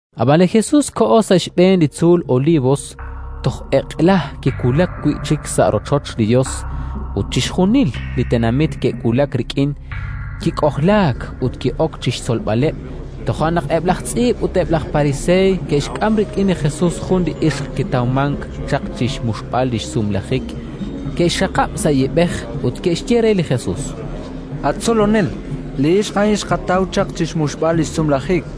Ab'an li Jesus koho sa' xb'een li tzuul Olivos. Toj eq'la kiwulak wi' chik sa' rochoch li Yos, ut chixjunil li tenamit ke'wulak rik'in: kik'ojlaak ut ki'ok chi xtzolb'aleb'. Toja' naq eb' laj tz'iib' ut eb' laj pariseey ke'xk'am rik'in li Jesus jun li ixq kitawmank chaq chi xmuxb'al li xsumlajik; ke'xxaqab' sa' yiib'ej ut ke'xye re li Jesus: —At Tzolonel, li ixq a'in xqataw chaq chi xmuxb'al li xsumlajik.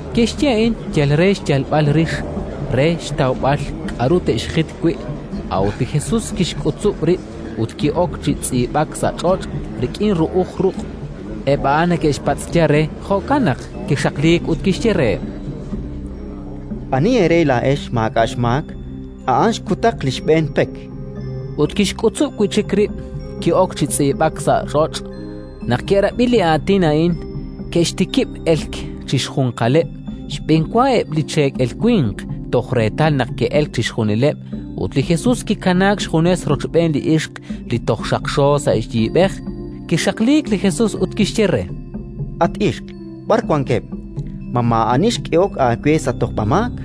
Ke'xye a'in yal re xyalb'al rix, re xtawb'al k'aru te'xjit wi'. A'ut li Jesus kixk'utzub' rib' ut ki'ok chi tz'iib'ak sa' ch'och' rik'in ru'uj ruq'. Eb' a'an neke'xpatz'ya re, jo'kan naq kixaqliik ut kixye reheb': —Ani eere laa'ex maak'a' xmaak, a'an xkutaq li xb'een pek. Ut kixk'utzub' wi' chik rib', ki'ok chi tz'iib'ak sa' ch'och'. Naq ke'rab'i li aatin a'in, ke'xtikib' elk chi xjunjunqaleb', xb'enwa eb' li cheekel winq, toj reetal naq ke'elk chixjunileb'; ut li Jesus kikanaak xjunes rochb'een li ixq li toj xaqxo sa' yiib'ej. Kixaqliik li Jesus ut kixye re: —At ixq, b'ar wankeb'? Ma maa'ani xk'ehok aawe sa' tojb'amaak?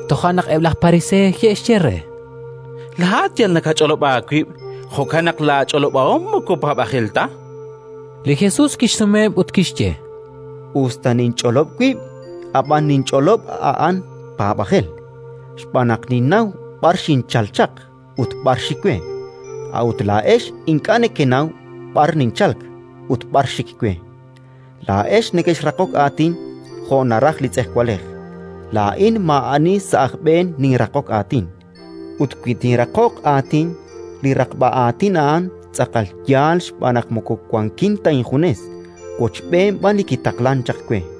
Toja' naq eb' laj Pariseey ke'xye re: —Laa'at yal nakach'olob' aawib'; jo'kan naq laach'olob'ahom moko paab'ajel ta. Li Jesus kixsumeheb' ut kixye: —Us ta ninch'olob' wib', ab'an li ninch'olob' a'an paab'ajel, xb'aan naq ninnaw b'ar xinchalk chaq ut b'ar xik we; a'ut laa'ex ink'a' nekenaw b'ar ninchalk ut b'ar xik we. Laa'ex nekexraqok aatin jo' naraj li tz'ejwalej; laa'in maa'ani sa' aj b'een ninraqok aatin. Ut wi tinraqoq aatin, linraqb'a aatin a'an tz'aqal yaal xb'aan naq moko wankin ta injunes, wochb'een b'an li kitaqlank chaq we.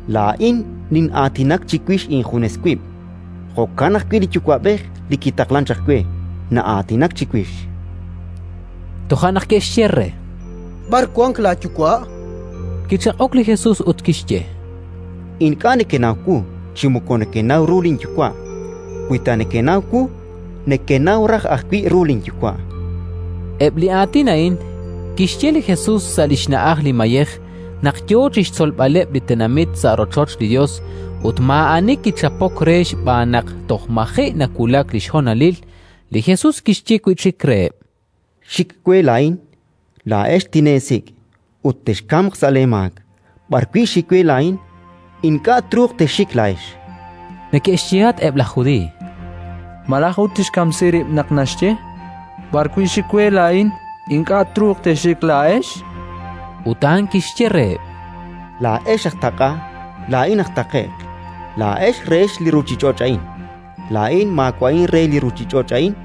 Laa'in nin'aatinak chiwix injunes wib'; jo'kan ajwi' li Yuwa'b'ej li kitaqlank chaq we, na'aatinak chiwix. Toja' naq ke'xye re: —B'ar wank laaYuwa'? Kichaq'ok li Jesus ut kixye: —Ink'a' nekenaw wu chi moko nekenaw ru linYuwa'; wi ta nekenaw wu, nekenaw raj ajwi' ru linYuwa'. Eb' li aatin a'in kixye li Jesus sa' li xna'aj li mayej, naq yo chi xtzolb'aleb' li tenamit sa' rochoch li Yos. Ut maa'ani kichapok re xb'aan naq toj maji' nawulak li xhonalil. Li Jesus kixye wi' chik reheb': —Xik we laa'in. Laa'ex tineesik', ut texkamq sa' leemaak. B'ar wi' xik we laa'in, ink'a' truuq texxik laa'ex. Neke'xyehatq eb' laj Judiiy: —Malaj ut tixkamsi rib' naq naxye: «B'ar wi' xik we laa'in, ink'a' truuq texxik laa'ex»? Ut a'an kixye reheb': —Laa'ex aj taq'a, laa'in aj taqe'q. Laa'ex rehex li ruuchich'och' a'in, laa'in maawa'in re li ruuchich'och' a'in.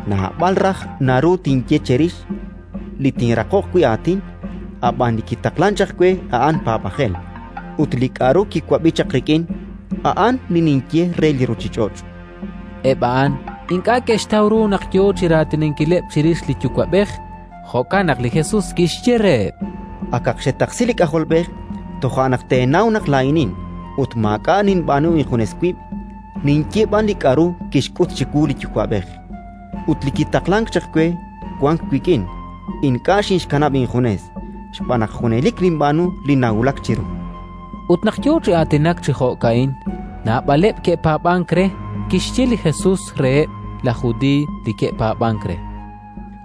Naab'al raj naru tinye cherix li tinraqoq wi' aatin, ab'an li kitaqlank chaq we a'an paab'ajel; ut li k'aru kiwab'i chaq rik'in, a'an li ninye re li ruuchich'och'. Eb' a'an ink'a' ke'xtaw ru naq yo chi raatinankileb' chirix li Yuwa'b'ej. Jo'kan naq li Jesus kixye reheb': —Akaq xetaqsi li K'ajolb'ej, toja' naq teenaw naq Laa'inin ut maak'a' ninb'aanu injunes wib', ninye b'an li k'aru kixk'ut chiwu li Yuwa'b'ej. Ut li kitaqlank chaq we wank wik'in: ink'a' xinxkanab' injunes, xb'aan naq junelik ninb'aanu li nawulak chiru. Ut naq yo chi aatinak chi jo'ka'in, naab'aleb' ke'paab'ank re. Kixye li Jesus reheb' laj Judiiy li ke'paab'ank re: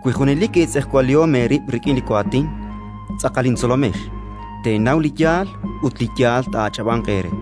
—Wi junelik eetz'ejwalihom eerib' rik'in li waatin, tz'aqal intzolomex; teenaw li yaal ut li yaal taa'ach'ab'anq eere.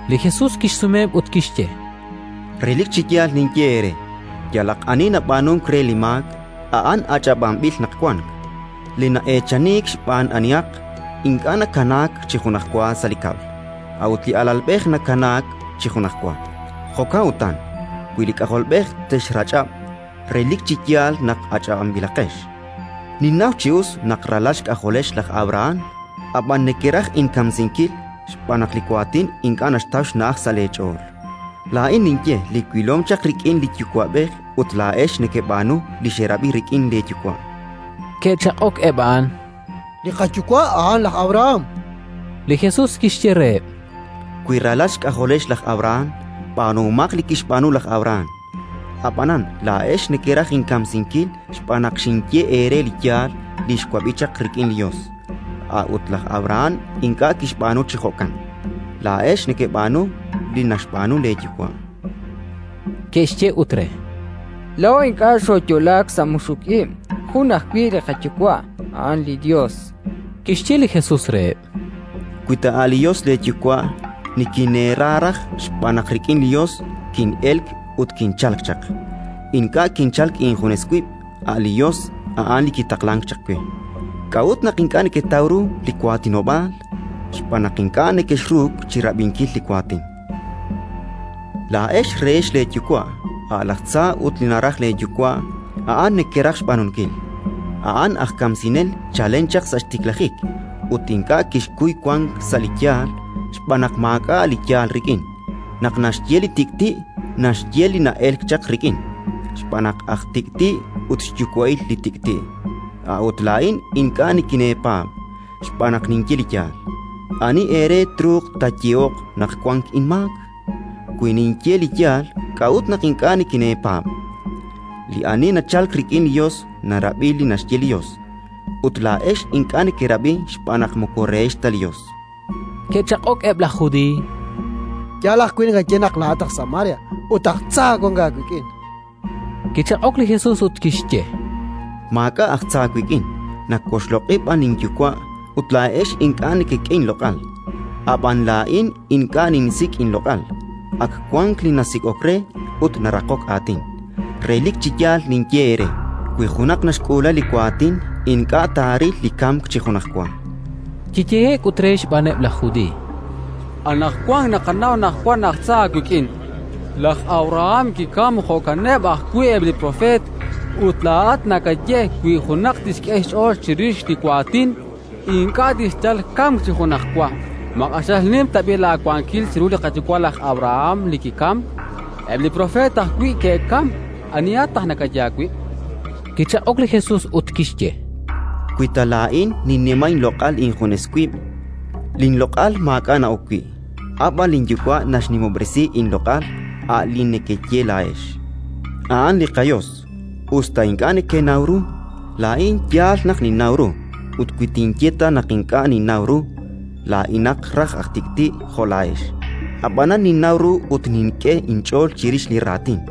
Li Jesus kixsumeheb' ut kixye: —Relik chi yaal ninye eere: yalaq ani nab'aanunk re li maak, a'an eechaninb'il naq wank. Li na'eechaniik xb'aan anihaq, ink'a' nakanaak chi junajwa sa' li kab'l; a'ut li alalb'ej nakanaak chi junajwa. Jo'kan utan, wi li K'ajolb'ej texrach'ab', relik chi yaal naq ach'ab'anb'ilaqex. Ninnaw chi us naq ralal xk'ajolex laj Abrahán; ab'an nekeraj inkamsinkil xb'aan naq li waatin ink'a' naxtaw xna'aj sa' leech'ool. Laa'in ninye li wilom chaq rik'in li Yuwa'b'ej ut laa'ex nekeb'aanu li xerab'i rik'in leeyuwa'. Ke'chaq'ok eb' a'an: —Li qayuwa' a'an laj Abrahán! chankeb'. Li Jesus kixye reheb': —Wi ralal xk'ajolex laj Abrahán, b'aanuhomaq li kixb'aanu laj Abrahán! Ab'anan laa'ex nekeraj inkamsinkil xb'aan naq xinye eere li yaal li xwab'i chaq rik'in li Yos. A'ut laj Abrahán ink'a' kixb'aanu chi jo'kan! Laa'ex nekeb'aanu li naxb'aanu leeyuwa'. Ke'xye ut re: —Laa'o ink'a' xooyo'laak sa' muxuk ib'; jun ajwi' li qayuwa': a'an li Yos! Kixye li Jesus reheb': —Wi ta a' li Yos leeYuwa', nikineera raj, xb'aan naq rik'in li Yos kin'elk ut kinchalk chaq. Ink'a' kinchalk injunes wib'; a' li Yos, a'an li kitaqlank chaq we. K'a'ut naq ink'a' neketaw ru li waatinob'aal? Xb'aan naq ink'a' nekexruuk chi rab'inkil li waatin. Laa'ex rehex leeyuwa', a' laj tza, ut li naraj leeyuwa' a'an nekeraj xb'aanunkil. A'an aj kamsinel chalen chaq sa' xtiklajik, ut ink'a' kixkuy wank sa' li yaal, xb'aan naq maak'a' li yaal rik'in. Naq naxye li tik'ti', naxye li na'elk chaq rik'in, xb'aan naq aj tik'ti' ut xyuwa'il li tik'ti'. A'ut laa'in ink'a' nikineepaab', xb'aan naq ninye li yaal. Ani eere truuq taayehoq naq wank inmaak? Wi ninye li yaal, k'a'ut naq ink'a' nikineepaab'? Li ani nachalk rik'in li Yos narab'i li naxye li Yos; ut laa'ex ink'a' nekerab'i xb'aan naq moko rehex ta li Yos. Ke'chaq'ok eb' laj Judiiy: —Yaal ajwi' naqaye naq laa'at aj Samaria ut aj tza wank aawik'in, chankeb'. Kichaq'ok li Jesus ut kixye: —Maak'a' aj tza wik'in, nawoxloq'i b'an linYuwa' ut laa'ex ink'a' nekek'e inloq'al. Ab'an laa'in ink'a' ninsik' inloq'al; ak wank li nasik'ok re ut naraqok aatin. Relik chi yaal ninye eere: wi junaq naxk'uula li waatin, ink'a' taaril li kamk chi junajwa. Kiyehe'k ut re xb'aaneb' laj Judiiy: —Anaqwan naqanaw naq wank aj tza aawik'in. Laj Abrahán kikamk, jo'kaneb' ajwi' eb' li propeet, ut laa'at nakaye: «Wi junaq tixk'e xch'ool chirix li waatin, ink'a' tixyal li kamk chi junajwa». Ma q'axal nim tab'i' laawankil chiru li qayuwa' laj Abrahán li kikamk? Eb' li propeet ajwi' ke'kamk. Anihat naq nakaye aawib'? Kichaq'ok li Jesus ut kixye: —Wi ta laa'in ninnima inloq'al injunes wib', linloq'al maak'a' na'ok wi'. A' b'an linYuwa' naxnimob'resi inloq'al, a' li nekeye laa'ex: «A'an li qaYos», us ta ink'a' nekenaw ru. Laa'in yaal naq ninnaw ru, ut wi tinye ta naq ink'a' ninnaw ru, laa'inaq raj aj tik'ti' jo' laa'ex. Ab'anan ninnaw ru ut nink'e inch'ool chirix li raatin.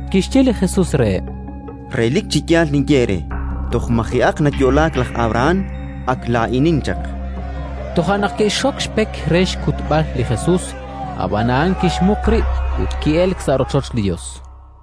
Kixye li Jesus reheb': —Relik chi yaal ninye eere: toj maji'aq nayo'laak laj Abrahán, ak Laa'inin chaq. Toja' naq ke'xxok xpek re xkutb'al li Jesus; ab'an a'an kixmuq rib' ut ki'elk sa' rochoch li Yos.